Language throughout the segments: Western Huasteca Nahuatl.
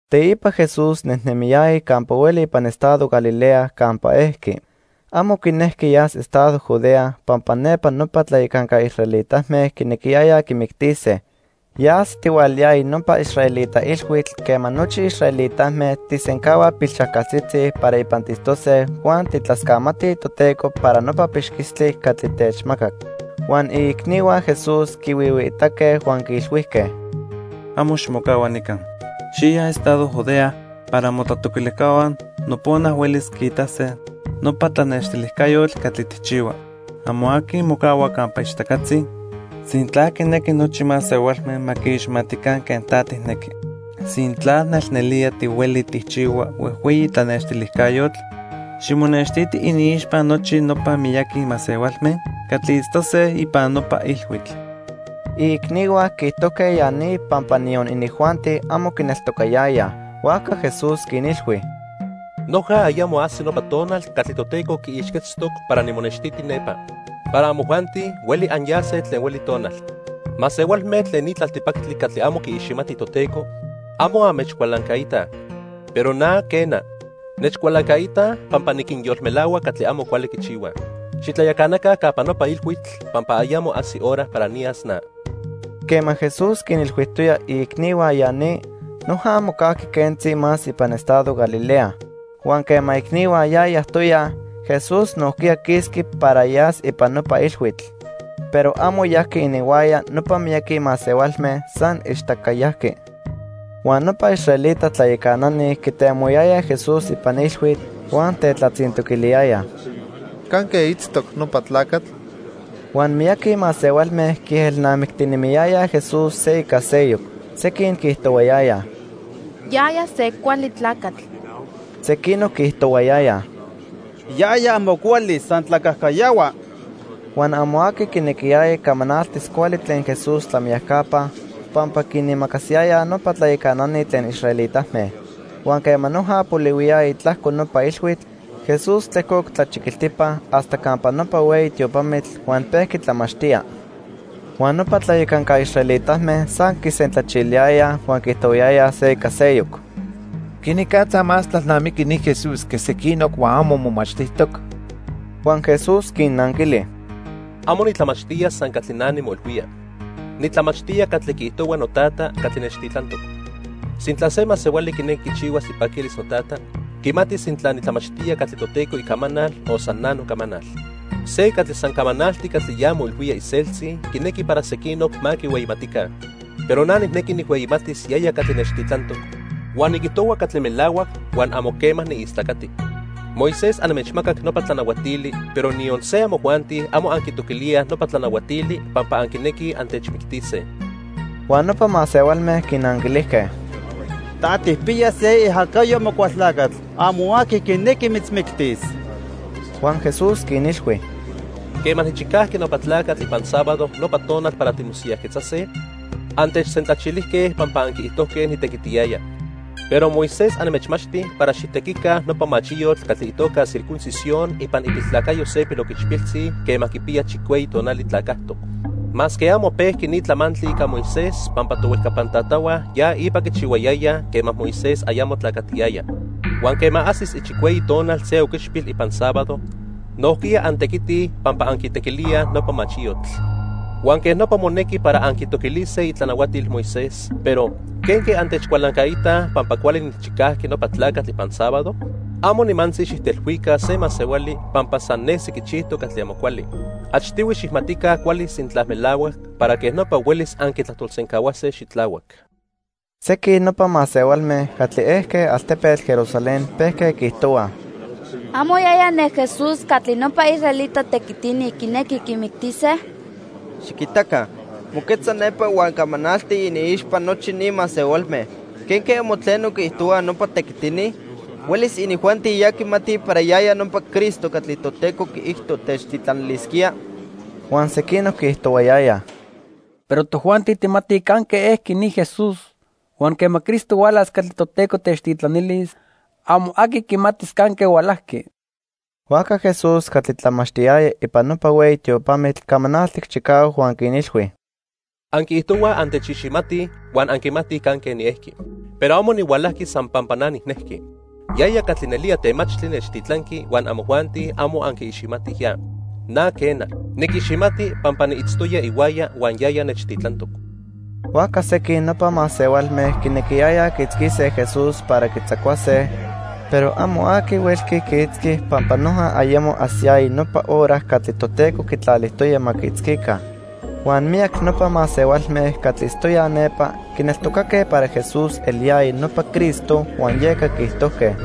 Teipa Jesús nejnemiyaya campa hueli ipan estado Galilea campa ejqui. Amo quinejqui yas estado Judea pampa nepa nopa tlayacanca israelitame quinequiyayaj quimictise. Ya ajsitihualayaya nopa israelita ilhuitl quema nochi israelitame tijsencahuaj pilxajcaltzitzi para ipan tiitztose huan tijtlascamatij Toteco para nopa pixquistli catli techmacac. Huan iicnihua Jesús quihuihuiitaque huan quiilhuijque: —Amo ximocahua nica. Xiya estado Judea para motlatoquilijcahua nopona huelis quiitase nopa tlanextilijcayotl catli tijchihua. Amo aqui mocahua campa ichtacatzi sintla quinequi nochi masehualme ma quiiximatica quen ta tijnequi. Sintla nelnelía tihueli tijchihua huejhueyi tlanextilijcayotl, ximonextiti iniixpa nochi nopa miyaqui masehualme catli itztose ipan nopa ilhuitl. Iicnihua quiijtojque ya ni pampa niyon inijuanti, amo quineltocayayaj. Huajca Jesús quinilhui: —Noja ayamo ajsi nopa tonal catli Toteco quiixquetztoc para nimonextiti nepa. Para amojuanti, hueli anyase tlen hueli tonal. Masehualme tlen ni tlaltipactli catli amo quiiximatij Toteco, amo anmechcualancaitaj. Pero na, quena, nechcualancaitaj pampa niquinyolmelahua catli amo cuali quichihuaj. Xitlayacanaca campa nopa ilhuitl pampa ayamo ajsi hora para niyas na. Quema Jesús quinilhuijtoya iicnihua ya ni, noja mocajqui quentzi más ipan estado Galilea. Huan quema iicnihua ya yajtoyaj, Jesús nojquiya quisqui para yas ipan nopa ilhuitl. Pero amo yajqui ininhuaya nopa miyaqui masehualme, san ichtaca yajqui. Huan nopa israelita tlayacanani quitemohuayayaj Jesús ipan ilhuitl huan tetlatzintoquiliyayaj: —¿Canque itztoc nopa tlacatl? Huan miyaqui masehualme quiejelnamictinemiyayaj Jesús se ica seyoc. Sequin quiijtohuayayaj: "Yaya se cuali tlacatl." Sequinoc quiijtohuayayaj: "Yaya amo cuali, san tlacajcayahua." Huan amo aqui quinequiyaya camanaltis cuali tlen Jesús tlamiyacapa pampa quinimacasiyayaj nopa tlayacanani tlen israelitame. Huan quema noja polihuiyaya tlajco nopa ilhuitl, Jesús tlejcoc tlachiquiltipa hasta campa nopa hueyi tiopamitl huan pejqui tlamachtía. Huan nopa tlayacanca israelitame san quisentlachiliyayaj huan quiijtohuayayaj se ica seyoc: —¿Quenicatza más tlalnamiqui ni Jesús que sequinoc huan amo momachtijtoc? Huan Jesús quinnanquili: —Amo nitlamachtía san catli na nimoilhuía. Nitlamachtía catli quiijtohua noTata catli nechtitlantoc. Sintla se masehuali quinequi quichihuas ipaquilis noTata, quimatis sintla nitlamachtía catli Toteco icamanal o san na nocamanal. Se catli san camanalti catli ya moilhuía iseltzi quinequi para sequinoc ma quihueyimatica. Pero na nijnequi nijhueyimatis yaya catli nechtitlantoc, huan niquijtohua catli melahuac huan amo quema niistlacati. "Moisés anmechmacac nopa tlanahuatili, pero niyon se amojuanti amo anquitoquilíaj nopa tlanahuatili pampa anquinequij antechmictise." Huan nopa masehualme quinanquilijque: —Ta tijpiya se iajacayo Amocualtlacatl. Amo aqui quinequi mitzmictis. Huan Jesús quinilhui: —Quema nijchicajqui nopa tlacatl ipan sábado nopa tonal para timosiyajquetzase, antechsentlachilijque pampa anquiijtojque nitequitiyaya. Pero Moisés anmechmachti para xijtequica nopa machiyotl catli itoca circuncisión ipan ipiltlacayo se piloquichpiltzi quema quipiya chicueyi tonali tlacajtoc. (Masque amo pejqui ni tlamantli ica Moisés pampa tohuejcapan tatahua ya ipa quichihuayayaj quema Moisés ayamo tlacatiyaya.) Huan quema ajsis ichicueyi tonal se oquichpil ipan sábado, nojquiya antequitij pampa anquitequilíaj nopa machiyotl. Huan quej nopa monequi para anquitoquilise itlanahuatil Moisés, pero ¿quenque antechcualancaitaj pampa cuali nijchicajqui nopa tlacatl ipan sábado? Amo nimantzi xijtelhuica se masehuali pampa san nesi quichijtoc catli amo cuali. Achtihui xijmatica cuali sintla melahuac, para quej nopa huelis anquitlajtolsencahuase xitlahuac. Sequin nopa masehualme catli ejque altepetl Jerusalén pejque quiijtohuaj: —¿Amo yaya ne Jesús catli nopa israelita tequitini quinequij quimictise? Xiquitaca, moquetza nepa huan camanalti iniixpa nochi ni masehualme. ¿Quenque amo tleno quiijtohuaj nopa tequitini? ¿Huelis inijuanti ya quimatij para yaya nopa Cristo catli Toteco quiijto techtitlanilisquía? Huan sequinoc quiijtohuayayaj: —Pero tojuanti tijmatij canque ejqui ni Jesús huan quema Cristo hualas catli Toteco techtitlanilis, amo aqui quimatis canque hualajqui. Huajca Jesús catli tlamachtiyaya ipan nopa hueyi tiopamitl camanaltic chicahuac huan quinilhui: —Anquiijtohuaj antechiximatij huan anquimatij canque niejqui. Pero amo nihualajqui san pampa na nijnejqui. Yaya catli nelía temachtli nechtitlanqui huan amojuanti amo anquiiximatij ya. Na quena, niquiximati pampa niitztoya ihuaya huan yaya nechtitlantoc. Huajca sequin nopa masehualme quinequiyayaj quiitzquise Jesús para quitzacuase, pero amo aqui huelqui quiitzqui pampa noja ayamo ajsiyaya nopa hora catli Toteco quitlalijtoya ma quiitzquica. Huan miyac nopa masehualme catli itztoyaj nepa, quineltocaque para Jesús eliyaya nopa Cristo huan yeca quiijtojque: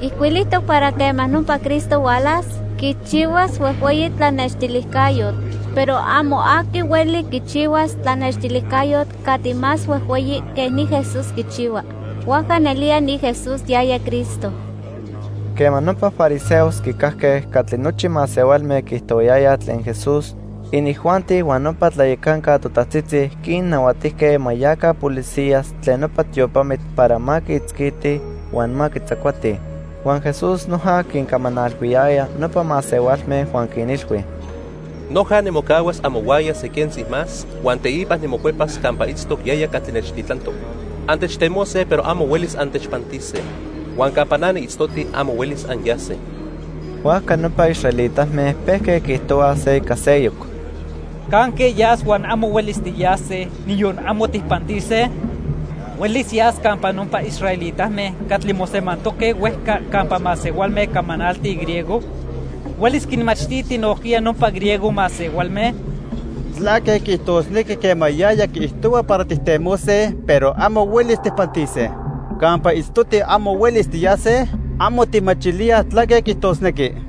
—Ijcuilijtoc para quema nopa Cristo hualas, quichihuas huejhueyi tlanextilijcayotl. Pero amo aqui hueli quichihuas tlanextilijcayotl catli más huejhueyi que ni Jesús quichihua. Huajca nelía ni Jesús yaya Cristo. Quema nopa fariseos quicajque catli nochi masehualme quiijtohuayayaj tlen Jesús, inijuanti huan nopa tlayacanca totajtzitzi quinnahuatijque ma yaca policías tlen nopa tiopamitl para ma quiitzquitij huan ma quitzacuatij. Huan Jesús noja quincamanalhuiyaya nopa masehualme huan quinilhui: —Noja nimocahuas amohuaya se quentzi más huan teipa nimocuepas campa itztoc yaya catli nechtitlantoc. Antechtemose pero amo huelis antechpantise. Huan campa na niitztoti amo huelis anyase. Huajca nopa israelitame pejque quiijtohuaj se ica seyoc: —¿Canque yas huan amo huelis tiyase, niyon amo tijpantise? ¿Huelis yas campa nopa israelitame catli mosemantoque huejca campa masehualme camanaltij griego? ¿Huelis quinmachtiti nojquiya nopa griego masehualme? ¿Tlaque quiijtosnequi quema yaya quiijtohua para tijtemose, pero amo huelis tijpantise? ¿Campa itztoti amo huelis tiyase? Amo tijmachilíaj tlaque quiijtosnequi.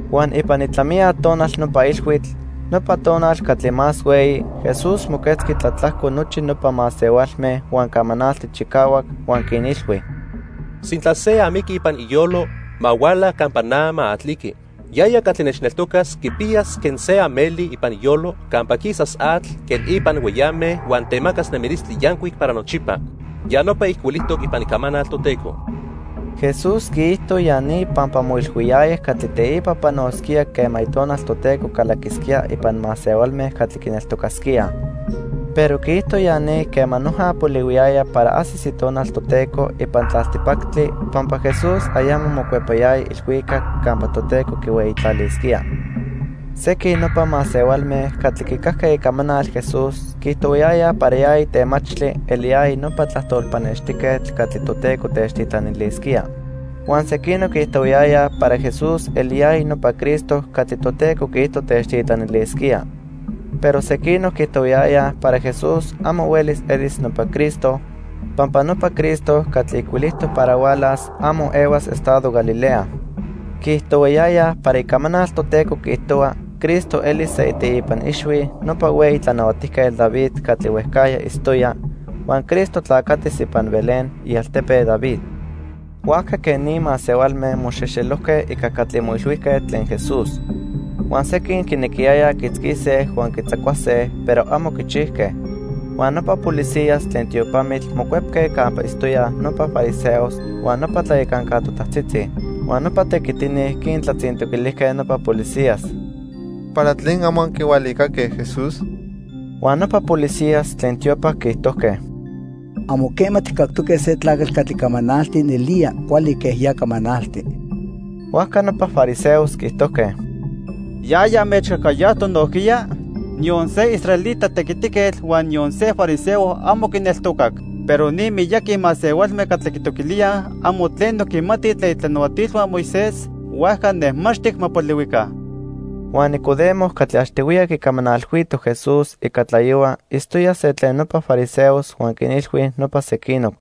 Huan ipan itlamiya tonal nopa ilhuitl, nopa tonal catli más hueyi, Jesús moquetzqui tlatlajco nochi nopa masehualme huan camanaltic chicahuac, huan quinilhui: —Sintla se amiqui ipan iyolo, ma huala campa na ma atliqui. Yaya catli nechneltocas quipiyas quen se ameli ipan iyolo campa quisas atl quen ipan hueyame huan temacas nemilistli yancuic para nochipa. Ya nopa ijcuilijtoc ipan Icamanal Toteco. Jesús quiijto ya ni pampa moilhuiyaya catli teipa panosquía quema Itonal Toteco calaquisquía ipan masehualme catli quineltocasquíaj. Pero quiijto ya ni quema noja polihuiyaya para ajsis Itonal Toteco ipan tlaltipactli pampa Jesús ayamo mocuepayaya ilhuicac campa Toteco quihueyitlalisquía. Sequin nopa masehualme catli quicajque icamanal Jesús quiijtohuayayaj para yaya temachtli eliyaya nopa tlajtol pannextijquetl catli Toteco techtitlanilisquía. Huan sequinoc quiijtohuayayaj para Jesús eliyaya nopa Cristo catli Toteco quiijto techtitlanilisquía. Pero sequinoc quiijtohuayayaj para Jesús amo huelis elis nopa Cristo, pampa nopa Cristo catli ijcuilijtoc para hualas, amo ehuas estado Galilea. Quiijtohuayayaj para Icamanal Toteco quiijtohua Cristo elis se iteipa ixhui nopa hueyi Tlanahuatijquetl David catli huejcajya itztoya, huan Cristo tlacatis ipan Belén, ialtepe David. Huajca quej ni masehualme moxejxelojque ica catli moilhuijque tlen Jesús. Huan sequin quinequiyayaj quiitzquise huan quitzacuase, pero amo quichijque. Huan nopa policías tlen tiopamitl mocuepque campa itztoyaj nopa fariseos huan nopa tlayacanca totajtzitzi. Huan nopa tequitini quintlatzintoquilijque nopa policías: —¿Para tlen amo anquihualicaque Jesús? Huan nopa policías tlen tiopa quiijtojque: —Amo quema tijcactoque se tlacatl catli camanalti nelía cuali quen ya camanalti. Huajca nopa fariseos quiijtojque: —¿Yaya anmechcajcayajtoc nojquiya? Niyon se israelita tequitiquetl huan niyon se fariseo amo quineltocac. Pero ni miyaqui masehualme catli quitoquilíaj, amo tleno quimatij tlen itlanahuatilhua Moisés, huajca nejmaxtic ma polihuica. Huan Nicodemo catli achtihuiya quicamanalhuito Jesús ica tlayohua itztoya se tlen nopa fariseos huan quinilhui nopa sequinoc: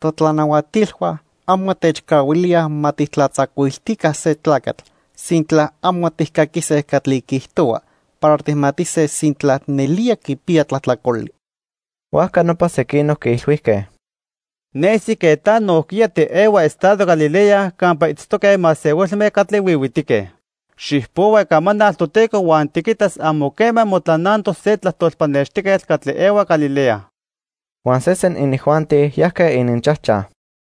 —Totlanahuatilhua amo techcahuilíaj ma tijtlatzacuiltica se tlacatl sintla amo tijcaquise catli quiijtohua para tijmatise sintla nelía quipiya tlajtlacoli. Huajca nopa sequinoc quiilhuijque: —Nesi quen ta nojquiya tiehua estado Galilea campa itztoque masehualme catli huihuitique. Xijpohua Icamanal Toteco huan tiquitas amo quema motlanantoc se tlajtol pannextijquetl catli ehua Galilea. Huan sesen inijuanti yajque ininchajchaj.